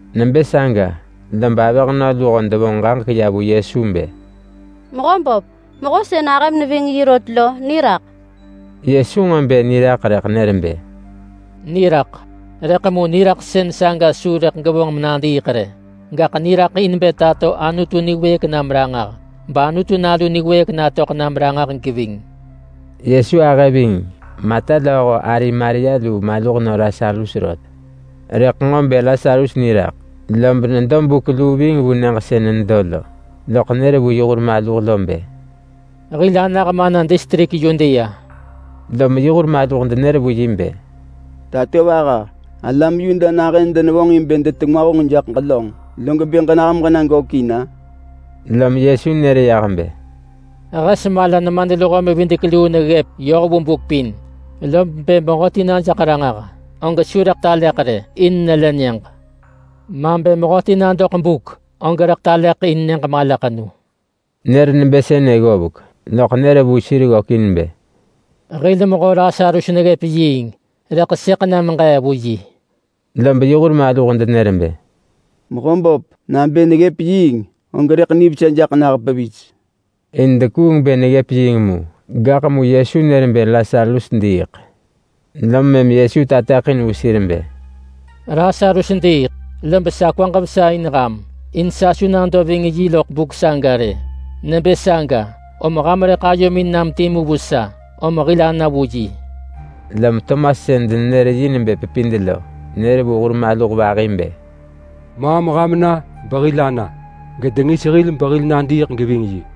Nebë saga, lob avëhnö luho devonġ ġaġek ya vu Yesu bë, “Mehöböp, mehö sën ahëm neving rot lo, niraḳ!” Yesu nġo bë niraḳ rëḳ nër bë, “Niraḳ, rëḳ mu niraḳsën saga su rëḳ gevonġ menadiiḳ rë! Gaḳ niraḳ in bë tato Anutu niwëëk nam ranġah bAnutu Nalu niwëëk natöḳ nam ranġah geving.” Yesu ahë ving Marta lööho ari Maria lu maluhnö Lasarus rot. Rëḳ nġo bë Lasarus niraḳ lob nedo buk luu ving vu nyëġ sën nedo lo, loḳ nër vu yi hur maluh bë, “Hil anah mana distrik Yudea.” Lom yi hur maluh denër vu yi bë, “Tatovaha! Alam Yuda nahën denevonġ in bë detengwa honġ jaḳ ġelönġ, log bë ġenah meġena gökin-a?” Lom Yesu nër yah bë, “Hes mala nemadluho-mevidek-luu neggëp yoh vu buk pin, lob bë mehöti na jaḳ ranġah, og su rëḳ taleḳ rë, in nelë nyëġ. Ma bë mehöti na doḳ buk, og rëḳ taleḳ in nyëġ malaḳenu.” Nër nebë sënë ggovek, loḳ nër vu sir ggökin bë, “Hil mehö Lasarus neggëp yiing rëḳ sëḳ na megee vu yi.” Lob yi hur maluh denër bë, “Mehöböp, nabë neggëp yiing, og rëḳ nivesa jaḳ nah pevis!” In dekuung bë neggëp yiing mu, gaḳ mu Yesu nër bë Lasarus diiḳ. Lom mëm Yesu tateḳin vu sir bë, “Lasarus diiḳ! Lob sa kwaġ vesa in ham in sa su nado ving yi vu buk saga rë. Nebë saga om ham rëḳ ayomin nam timu vu sa, om hil ana vu yi.” Lom Tomas sën denenër yi nebë Pepid lo, nër vu hur maluh vahi bë, “Maam ham na behil ana, gedengis hil behil nadiiḳ geving yi.”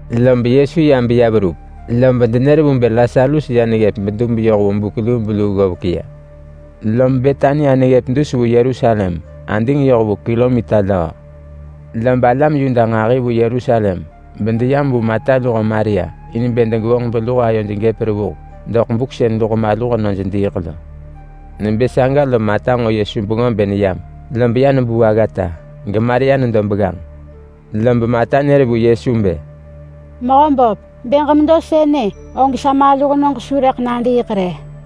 Log mëm Yesu ya beya verup, lob denër vu bë Lasarus ya neggëp bedub yoh vu buk lubeluu ggovek. Lob Betania neggëp dus vu Yerusalem (ading yoh vu kilomita löö). Lob alam Yuda nġahi vu Yerusalem bedeyam vu Marta luho Maria in bë degevonġ beluho ayoj nivesa jaḳ doḳ buk sën luho maluhnöj diiḳ lo. Nebë saga lom Marta nġo Yesu bengö bë neyam, lob ya nebuu aggata. GeMaria nedo begganġ. Lob Marta nër vu Yesu bë, “Mehöböp, bë ġemedo sënë, og sa maluhnög su rëḳ nadiiḳ rë.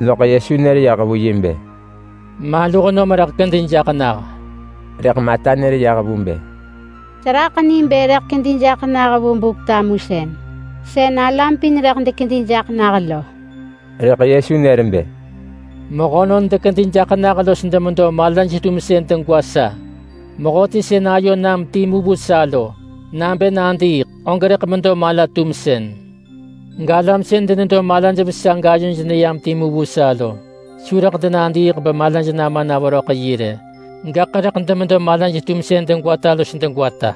Loḳ Yesu nër yah vu yi bë, “Maluhnöm rëḳ kedi jaḳ nah!” Rëḳ Marta nër yah vu bë, “Seraḳ ni bë rëḳ kedi jaḳ nah vu Buk-tamusën, sën alam pin rëḳ dekedi jaḳ nah lo.” Rëḳ Yesu nër bë, “Mehönon dekedi jaḳ nah los demedo malaj-tumsën degwa sa. Mehöti sën ayo nam timu vu sa lo, nabë nadiiḳ, og rëḳ medo mala-tumsën. Galam sën denedo malaj vesa gayoj neyam timu vu sa lo, su rëḳ denadiiḳ bemalaj nama na veröḳ yi rë. Gaḳ rëḳ demedo malaj-tumsën degwata los degwata.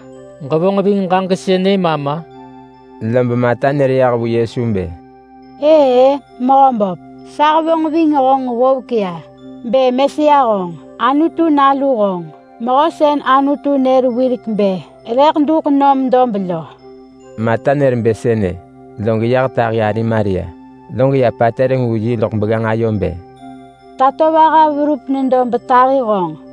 Ġevonġ ving ġaġek sënë ma ma?” Lob Marta nër yah vu Yesu bë, “Ëë-ë Mehöböp! Sa hevonġ ving honġ ggovek ya bë Mesia honġ! Anutu Nalu honġ! Mehö sën Anutu nër wirek bë rëḳ duḳ nam dob lo.” Marta nër bë sënë, log yah tahi ari Maria. Log ya patereng vu yi loḳ begganġ ayo bë, “Tatovaha verup nedo betahi honġ.”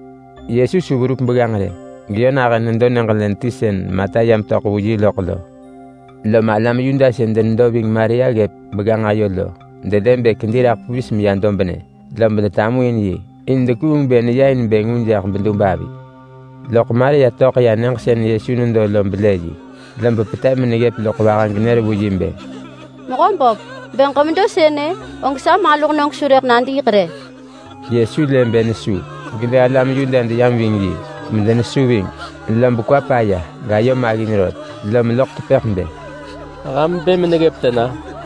Yesu su verup begganġ rë, geyö nahën nedo nyëġ len ti sën Marta ya metöḳ vu yi loḳ lo. Lom alam Yuda sën denedo ving Maria ggëp begganġ ayo lo, delë bë kedi raḳ pevis meya dobnë, lob detamuin yi, in dekuung bë neya in bë ngu jaḳ bedub avi. Loḳ Maria töḳ ya nyëġ sën Yesu nedo lo belë yi, lob petev meneggëp loḳ vaha genër vu yi bë, “Mehöböp, bë ġemedo sënë, og sa maluhnög su rëḳ nadiiḳ rë!” Yesu lë bë nesu, gelë alam Yuda deyam ving yi, medenesu ving. Lob kwa paya gayo maggin rot lom loḳ tepëḳ bë, “Ham bë meneggëp tena?”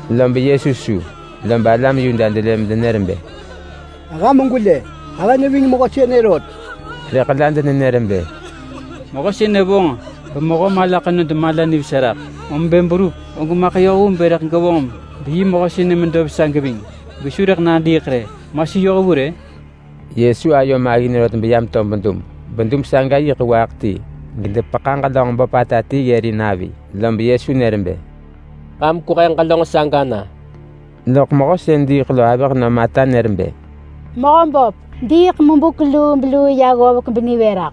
Lob Yesu su. Lob alam Yuda delë medenër bë, “Ham gwelë! Ahë neving mehö sënë rot!” Rëḳ la denenër bë, “Mehö sënë vonġ bemehö mala ḳenod mala nivesa raḳ, om bë berup og maḳ yoh vu bë rëḳ gevonġ beyi mehö sënë medo vesa geving gesu rëḳ nadiiḳ rë, ma su yoh vu rë?” Yesu ayo maggin rot beya meto bedub. Bedub saga yiḳ waaḳ ti gedepeḳa ġelönġ böpata ti ggërin avi. Lob Yesu nër bë, “Ham kwehe ġelönġ saga na!” Loḳ mehö sën diiḳ lo avëhnö Marta nër bë, “Mehöböp! Diiḳ mebuk lubeluu ya ggovek benivë raḳ!”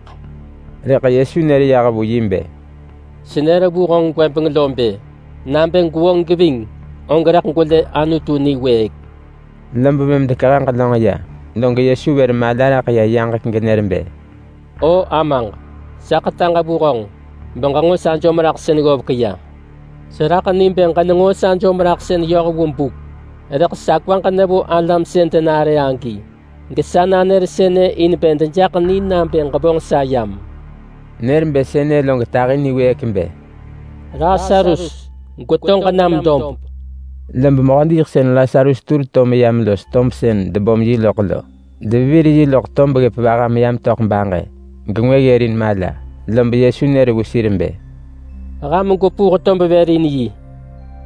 Rëḳ Yesu nër yah vu yi bë, “Senër vu honġ gwëbeng lo bë, nabë gwevonġ geving, og rëḳ gwelë Anutu niwëëk!” Lob mëm dekehe ġelönġ ya, log Yesu vër mala raḳ ya yaġek genër bë, “O Amaġ! Sa ḳetaġ vu honġ beġenġo sa jom-raḳsën ggovek ya. Seraḳ ni bë ġenenġo sa jom-raḳsën yoh vu buk, rëḳ sa kwaġ nevo alam sën denare agi, gesa nanër sënë in bë dejaḳ ni nabë ġevonġ sa yam.” Nër bë sënë log tahi niwëëk bë, “Lasarus! Gweto ġenam dob!” Lob mehö diiḳsën Lasarus tur to meyam los tob sën debom yi loḳ lo. Devevir yi loḳ tob ggëp vaha beya metöḳ baġë, gengwë ggërin mala. Lob Yesu nër vu sir bë, “Ham gwepuh tob vër in yi!”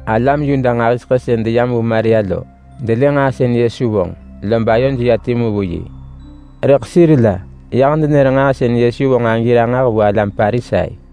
Alam Yuda nġahiseḳë sën deyam vu Maria lo, delë nġaa sën Yesu vonġ, lob ayoj ya timu vu yi. Rëḳ sir la yah denër nġaa sën Yesu vonġ agi ranġah vu alam Parisai.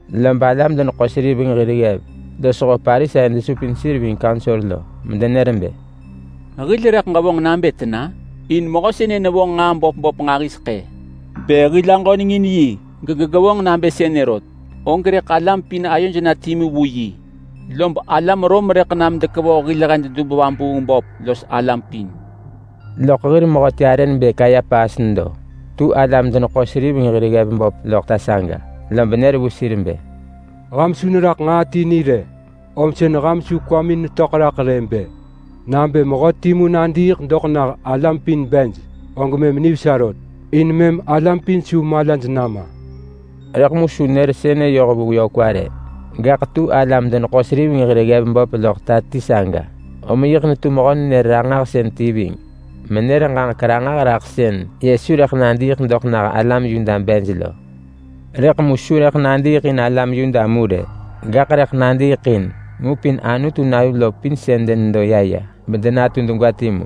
Lob alam-deneḳo-seriveng hir ggev losho Parisai desupin sir ving Kaunsor medenër bë, “Hil rëḳ ġevonġ nabë tena? In mehö sënë nevonġ nġaa böp böp nġahiseḳë. Bë hil aġöneng in yi gegevonġ nabë sënë rot, og rëḳ alam pin ayoj na timu vu yi. Lob alam Rom rëḳ nam dekevoh hil hed dub-vabuung-böp los alam pin.” Loḳ hir mehöti arë nebë Kayapas nedo. Tu alam-deneḳo-seriveng hir ggev böp loḳ ta saga, lob nër vu sir bë, “Ham su neraḳ nġaa ti ni rë. Om sën ham su kwamin töḳ raḳ bë: Nabë mehö timu nadiiḳ doḳ nah alam pin bej, og mëm nivesa rë. In mëm alam pin su malaj nama.” Rëḳ su nër sënë yoh vu yö kwa rë. Gaḳ tu alam-deneḳo-seriveng hir ggev böp loḳ ta ti saga, om yiḳ netu mehö-nenër-ranġahsën ti ving menër ġaġek ranġah raḳ sën Yesu rëḳ nadiiḳ doḳ nah alam Yuda bej lo. Rëḳ mu su rëḳ nadiiḳ in alam Yuda mu rë, gaḳ rëḳ nadiiḳ in ngupin Anutu nalu lo pin sën denedo ya ya, bedenatu degwa timu.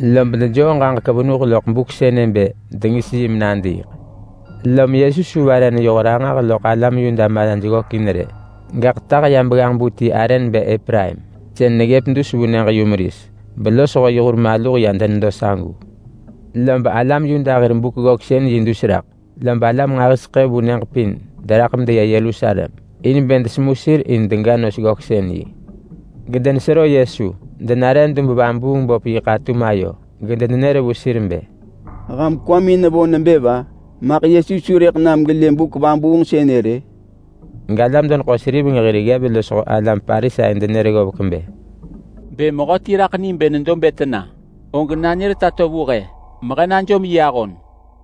Lob dejoo ġaġek venuh loḳ buk sënë bë dengis yi menadiiḳ. Lom Yesu su vare neyoh ranġah loḳ alam Yuda malaj ggökin rë, gaḳ tah meya begganġ-bu ti arë nebë Epraim, sën neggëp dus vu nyëġ-yumeris. Belosho yi hur maluh ya denedo sagu. Lob alam Yuda hir Buk-ggöksën-yi dus raḳ, lob alam nġahiseḳë vu nyëġ pin deraḳ medeya Yerusalem in bë desemu sir in dega nos-ggöksën-yi. Gedenesero Yesu. Denare dub-vabuung-böp yi ḳatum ayo, gedenenër vu sir bë, “Ham kwamin nevo nebë va? Maḳ Yesu su rëḳ nam gelë buk vabuung sënë rë?” Galam-deneḳo-seriveng hir ggev losho alam Parisai denër ggovek bë, “Bë mehöti raḳ ni bë nedo bë tena, og nanër tato vu he, mehe najom yi ahon.”